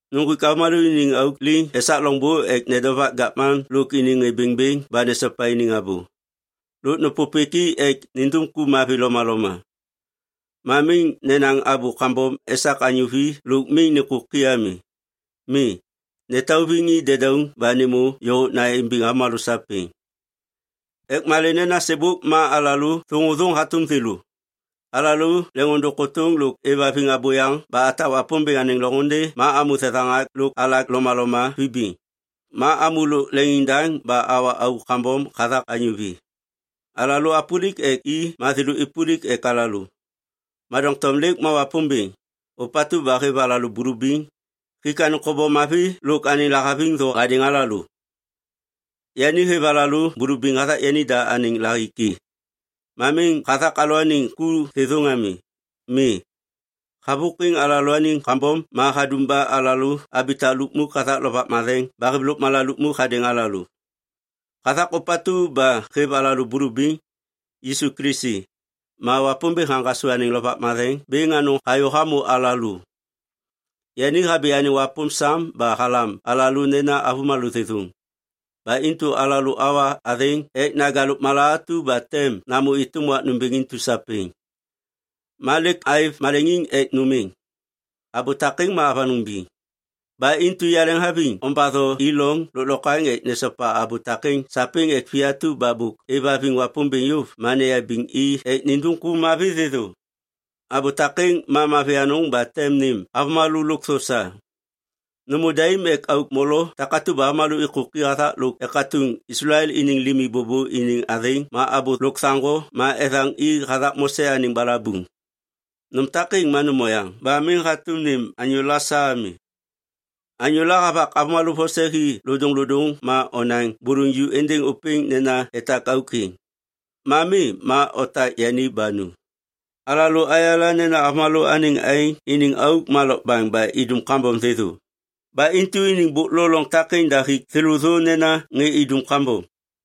Nuŋgwik avômalô iniŋ auk liŋ esak loŋbô ek nedovak gavman lôk iniŋ ŋê bêŋbêŋ ba nesopa iniŋ abô. Lôk nêpôpêk i ek nindum ku mavi lomaloma. Ma miŋ nenaŋ abô kambom esak anyô vi lôk miŋ nêkôki ami. Mi, netauviŋ i dedauŋ ba nêmô yôhôkna imbiŋ avômalô sapêŋ. Ek malê nena sêbôk ma alalô thôŋôthôŋ hatôm thêlô. Alalô leŋôndôŋ kôtôŋ lôk êvhaviŋ abôyaŋ ba atak Wapômbêŋ anêŋ loŋôndê ma amô thethaŋak lôk alak lomaloma vibiŋ. Ma amô lôk leŋiŋdaŋ ba awa auk kambom hathak anyô vi. Alalô apôlik ek i ma thêlô êpôlik ek alalô. Ma doŋtom lêk ma Wapômbêŋ, ôpatu ba hêv alalô bulubiŋ, hik anêŋ kobom mavi lôk anêŋ lahaviŋ thô hadêŋ alalô. Yani hêv alalô bulubiŋ hathak yanida anêŋ lahiki. Ma miŋ hathak alalôaniŋ ku thêthôŋ ami. Mi, havôkwiŋ alalôaniŋ kambom ma hadum ba alalô abitak lukmuk hathak Lovak Matheŋ ba hêv lôkmala lukmuk hadêŋ alalô. Hathak ôpatu ba hêv alalô bulubiŋ, Yisu Kilisi, ma Wapômbêŋ haŋgasô anêŋ Lovak Matheŋ bêŋ anôŋ hayô hamô alalô. Yani habi anêŋ wapôm sam ba halam alalô nena avômalô thêthôŋ. Ba intu alalô awa athêŋ ek naja lôkmala atu ba tem namô êtôm wak nômbêŋ intu sapêŋ. Ma lêk aêv maleŋiŋ ek nôm êŋ. Abô takêŋ ma avanôŋ biŋ. Ba intu yaleŋhaviŋ ombatho i loŋ lôklokwaŋ ek nesopa abô takêŋ sapêŋ ek vi atu ba bôk êvhaviŋ Wapômbêŋ yôv ma neyabiŋ i ek nindum ku mavi thêthô. Abô takêŋ ma mavi anôŋ ba tem nêm avômalô lôkthô sa. Nômô daim ek auk molo takatu ba avômalô êkôki hathak lôk ekatuŋ Islael iniŋ limi bôbô iniŋ athêŋ ma abô lôkthaŋgo ma ethaŋ i hathak Mose anêŋ balabuŋ. Nôm takêŋ ma nôm oyaŋ ba miŋ hatôm nêm anyôla sa ami. Anyôla havak avômalô vose hi lodôŋlodôŋ ma onaŋ bôlôŋ ju êndêŋ ôpêŋ nena etak auk êŋ. Ma mi ma otak yani ba nu. Alalô ayala nena avômalô anêŋ aêŋ iniŋ auk ma lokbaŋ ba idum kambom thêthô. Ba intu iniŋ bôk lo loŋ takêŋ da hik thêlô thô nena ŋê idum kambom.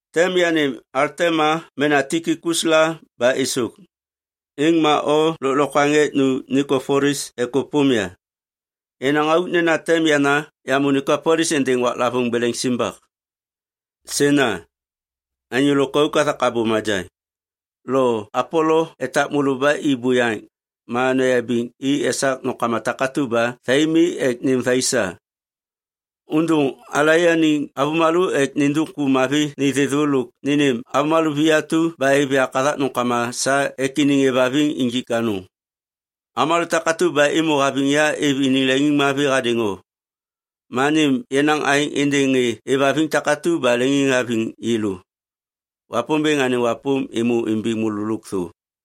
Tem yanêm Altema mena Tikikus la ba êsôk, êŋ ma o lôklokwaŋ ek nu Nikopolis ek ôpôm ya. Yenaŋ auk nena tem yana yamô Nikopolis êndêŋ waklavôŋ beleŋ simbak. Sena, anyô lôkauk hathak abô majaŋ, lo Apolo etak môlô ba i buyaŋ, ma noyabiŋ i esak nômkama takatu ba thai mi ek nêm thai sa. Ôndôŋ alaianiŋ avômalô ek nindum ku mavi ni thêthô lôk nênêm avômalô vi atu ba êv yak hathak nômkama sa ek iniŋ êvhaviŋ injik anôŋ. Avômalô takatu ba êmô haviŋ ya êv iniŋ leŋiŋmavi hadêŋ o. Ma nêm yenaŋ aêŋ êndêŋ ŋê êvhaviŋ takatu ba leŋiŋhaviŋ yêlô. Wapômbêŋ anêŋ wapôm êmô imbiŋ môlô lôkthô.